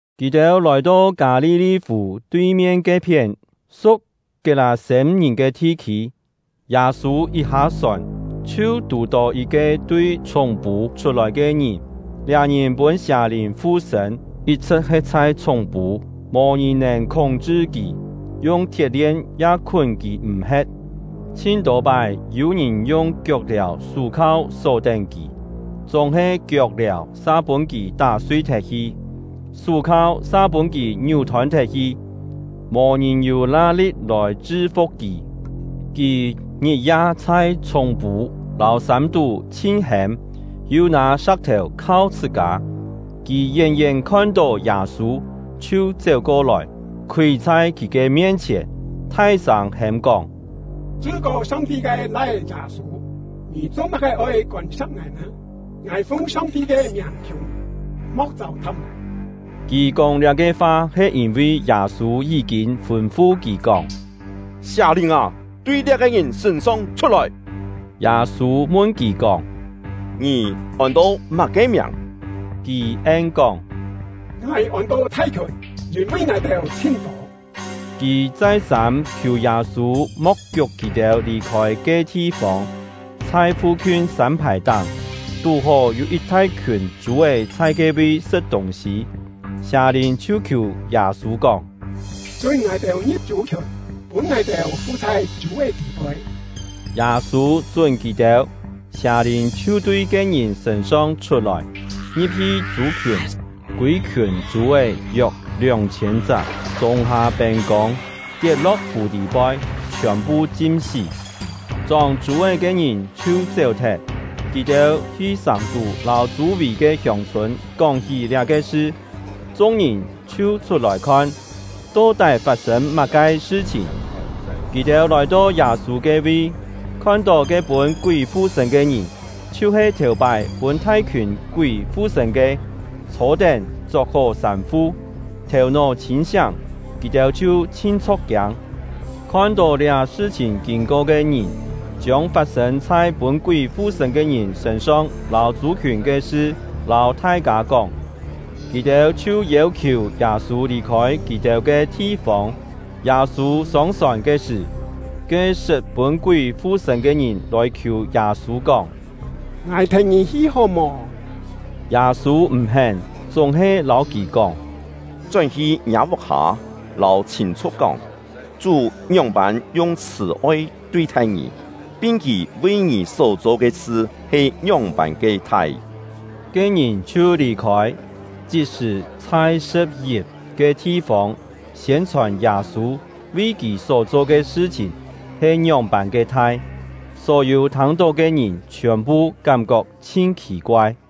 Kì-têu lòi-to Kâ-li-li-fù tui-mien ke-phién, su̍k Kiet-lâ-sêm-ngìn ke thi-khî. Yâ-sû yit hâ-sòn, chhiu tù-tó yit-ke tui chhúng-pû chhut-lòi ke ngìn; liá ngìn pûn sià-lìn fu-sṳ̂n, yit-chhṳ̍t he̍t chhai chhúng-pû, mò-ngìn nèn khúng-chṳ kì, yung thiet-lien ya khún kì m̀-he̍t. Chhin-tô pái yû-ngìn yung kiok-liàu sú-khau só-tén kì, chúng-he kiok-liàu sa pûn kì tá-sui thet-hi, sú-khau sa pûn kì ngiú-thôn thet-hi. Mò-ngìn yû la li̍t lòi chṳ-fu̍k kì! Kì ngit-ya chhai chhúng-pû lâu sân-tú chhin hêm, yu nâ sa̍k-thèu khau chhṳ-kâ. Kì yén-yén khon-tó Yâ-sû, chhiu chéu-ko-lòi, khúi chhai kì ke mien-chhièn, thai-sâng hêm-kóng: “Chṳ-kô Song-ti ke Lai-é Yâ-sû, ngì cho-má-ke oi kôn-sa̍p ngài nè? Ngài fung Song-ti ke miàng khiù ngì, mo̍k châu-tha̍p ngài!” (Kì kóng liá-ke fa he yîn-vi Yâ-sû yí-kîn fûn-fu kì kóng: “Sià-lìn â, tui liá-ke ngìn sṳ̂n-song chhut-lòi!”) Yâ-sû mun kì kóng: “Ngì ôn-to má-ke miàng?” Kì en-kóng: “Ngài ôn-to ‘Thai-khiùn’, yîn-vi ngài-têu chhin-tô!” Kì chai-sâm khiù Yâ-sû mo̍k kiuk kì-têu lì-khôi ke thi-fông. Chhai fu-khiun sân-phài-táng, tú-hó yû yit thai-khiùn chû-é chhai ke-vi sṳ̍t tûng-sî; sià-lìn chhiu khiù Yâ-sû kóng: “Chún ngài-têu ngi̍p chû-khiùn, pûn ngài-têu fu chhai chû-é tî-poi.” Yâ-sû chún kì-têu; sià-lìn chhiu tui ke-ngìn sṳ̂n-song chhut-lòi, ngi̍p-hi chû-khiùn; kûi-khiùn chû-é (yok lióng-chhiên-chak) chûng-hâ pên-kông, tiet-lo̍k fù tî-poi, chhiòn-phu chim-sí. Chóng chû-é ke ngìn chhiu chéu-thet; kì-têu hi sàng-tú lâu chû-vì ke hiông-chhûn kóng-hí liá-ke sṳ. Chung-ngìn chhiu chhut-lòi khon, to-tái fat-sên má-ke sṳ-chhìn. Kì-têu lòi-to Yâ-sû ke-vi, khon-tó ke pûn kúi fu-sṳ̂n ke ngìn, chhiu-he thèu-pái pûn thai-khiùn kúi fu-sṳ̂n ke, chhô-tén, chok-hó sâm-fu, thèu-nó chhîn-siáng; kì-têu chhiu chhin chho̍k-kiâng. Khon-tó liá sṳ-chhìn kîn-ko ke ngìn, chiông fat-sên chhai pûn kúi fu-sṳ̂n ke ngìn sṳ̂n-song lâu chû-khiùn ke sṳ lâu thai-kâ kóng. Kì-têu chhiu yêu-khiù Yâ-sû lì-khôi kì-têu ke thi-fông. Yâ-sû sông-sòn ke sṳ̀, ke sṳt pûn kúi fu-sṳ̂n ke ngìn lòi khiù Yâ-sû kóng: “Ngài thèn ngì hi hó-mò?” Yâ-sû m̀-hén, chúng-he lâu kì kóng: “Chón-hi ngiâ vuk-hâ, lâu chhîn-chhu̍k kóng, Chú ngióng-pân yung chhṳ̀-oi tui-thai ngì, pin Kì vi ngì só-cho ke sṳ he ngióng-pân ke thai.” Ke ngìn chhiu lì-khôi, chit-sṳ̀ chhai Sṳ̍p-yip ke thi-fông siên-chhòn Yâ-sû vi kì só-cho ke sṳ-chhìn he ngióng-pân ke thai; só-yû thâng-tó ke ngìn chhiòn-phu kám-kok chhin khì-koai.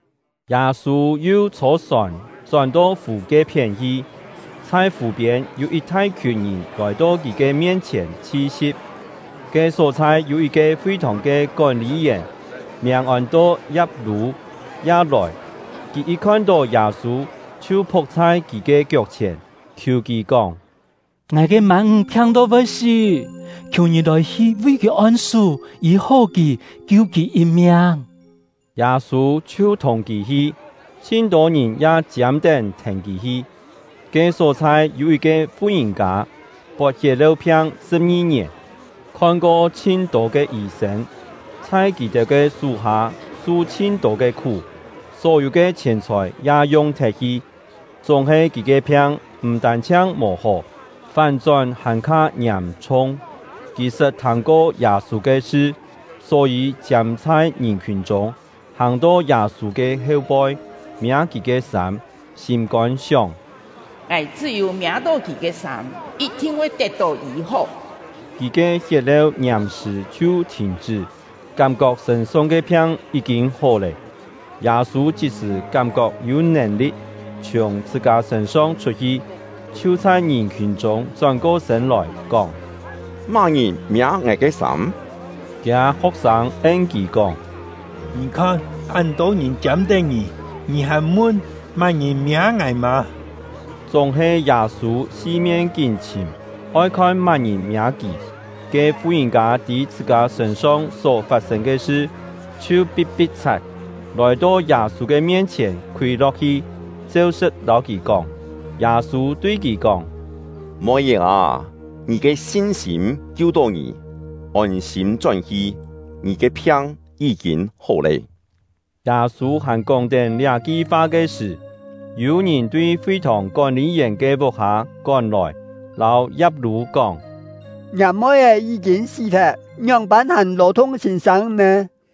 Yâ-sû yu chhô-sòn chón-to fù ke-phién hi; chhai fù-piên yû yit thai-khiùn ngìn lòi-to kì ke mien-chhièn chhi-si̍p. Ke só-chhai yû yit-ke fi-thòng ke kón-lî-yèn, miàng ôn-to Ya̍p-lû, ya lòi. Kì yit khon-tó Yâ-sû, chhiu phu̍k chhai kì ke kiok-chhièn, khiù kì kóng: “Ngài ke mân-ńg phiang-to voi sí, khiù ngì lòi-hi vi kì on-sú, yî-hó kì, kiu kì yit miang!” Yâ-sû chhiu thùng kì hi. Chhin-tô ngìn ya chiâm-tén thèn kì hi. Ke só-chhai yû yit-ke fu-ngìn-kâ, pot hiet-leu-phiang sṳ̍p-ngi ngièn, khon-ko chhin-tô ke yî-sên, chhai kì-têu ke sú-hâ su chhin-tô ke khú, só-yû ke chhièn-chhòi ya yung-thet-hi; chúng-he kì ke phiang m̀ tân-chhiang mò hó, fán-chón hàn-kha ngiàm-chhung. Kì sṳt thâng-ko Yâ-sû ke sṳ, só-yî chiâm chhai ngìn-khiùn chûng, hàng-to Yâ-sû ke heu-poi, miâ kì ke sâm, sîm-kôn sióng: “Ngài chṳ́-yû miâ-tó kì ke sâm, yit-thin voi tet-tó yî-hó.” Kì ke hiet-leu ngiàm-sṳ̀ chhiu thìn-chṳ́, kám-kok sṳ̂n-song ke phiang yí-kîn hó lé. Yâ-sû chit-sṳ̀ kám-kok yû nèn-li̍t chhiùng chhṳ-kâ sṳ̂n-song chhut-hi, chhiu chhai ngìn-khiùn chûng chón-ko sṳ̂n lòi, kóng: “Má-ngìn miâ ngài ke sâm?” Kiâ ho̍k-sâng en kì kóng: “Ngì khon, án tô ngìn chiâm-tén ngì, ngì hàn mun: ‘Má-ngìn miâ ngài’ mâ?” Chúng-he Yâ-sû si-mien kín chhìm, oi khon má-ngìn miâ kì. Ke fu-ngìn-kâ tî chhṳ-kâ sṳ̂n-song só fat-sên ke sṳ, chhiu pi̍t-pi̍t-chhat, lòi-to Yâ-sû ke mien-chhièn khúi lo̍k-hi, cheu-sṳ̍t lâu kì kóng. Yâ-sû tui kì kóng: “Moi-é â, ngì ke sin-sîm kiu-tó ngì! Ôn-sîm chón-hi, ngì ke phiang yí-kîn hó lé.” Yâ-sû hàn kóng-tén liá-ki fa ke sṳ̀, yû ngìn tui fi-thòng kón-lî-yèn ke vuk-hâ kón-lòi, lâu Ya̍p-lû kóng: “Ngiâ moi-é yí-kîn sí-thet, ngióng-pân hàn lò-thung sîn-sâng nè?”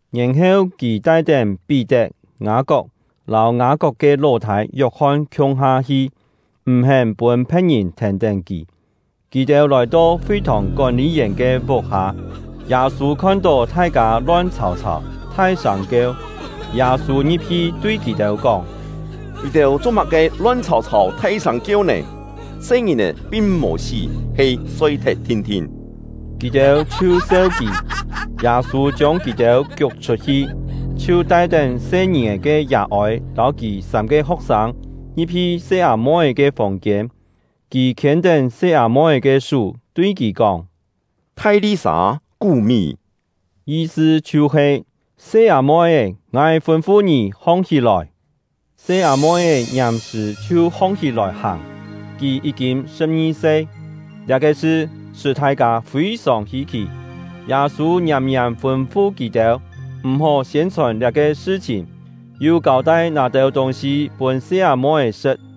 Yèn-heu kì tai-tén Pí-tet, Ngâ-kok, lâu Ngâ-kok ke ló-thâi Yok-hon khiung-ha hi, m̀-hén pûn phe̍t-ngìn thèn-tén kì. Kì-têu lòi-to fi-thòng kón-lî-yèn ke vuk-hâ, Yâ-sû khon-tó thai-kâ lon chhàu-chhàu, thai-sâng kieu. Yâ-sû ngi̍p-hi tui kì-têu kóng: “Ngì-têu cho-má-ke lon chhàu-chhàu thai-sâng kieu nè? Se-ngìn-è pin mò sí, he soi-thet thin-thin.” Kì-têu chhiu seu kì. Yâ-sû chiông kì-têu kiuk chhut-hi, chhiu tai-tén se-ngìn-è ke yà-ôi lâu kì sâm-ke ho̍k-sâng ngi̍p-hi se-â-moi-é ke fòng-kiên. Kì khiên-tén se-â-moi-é ke sú, tui kì kóng: “Thai-li-sâ, kú-mí!” Yi-sṳ chhiu-he: “Se-â-moi-é, ngài fûn-fu ngì, hong-hí-lòi!” Se-â-moi-é ngiàm-sṳ̀ chhiu hong-hí-lòi hàng. (Kì yí-kîn sṳ̍p-ngi-se). Liá-ke sṳ, sṳ́ thai-kâ fî-sòng hî-khì! Yâ-sû ngiàm-ngiàm fûn-fu kì-têu, m̀-hó siên-chhòn liá-ke sṳ-chhìn, yu kâu-tai nâ têu tûng-sî pûn se-â-moi-é sṳ̍t.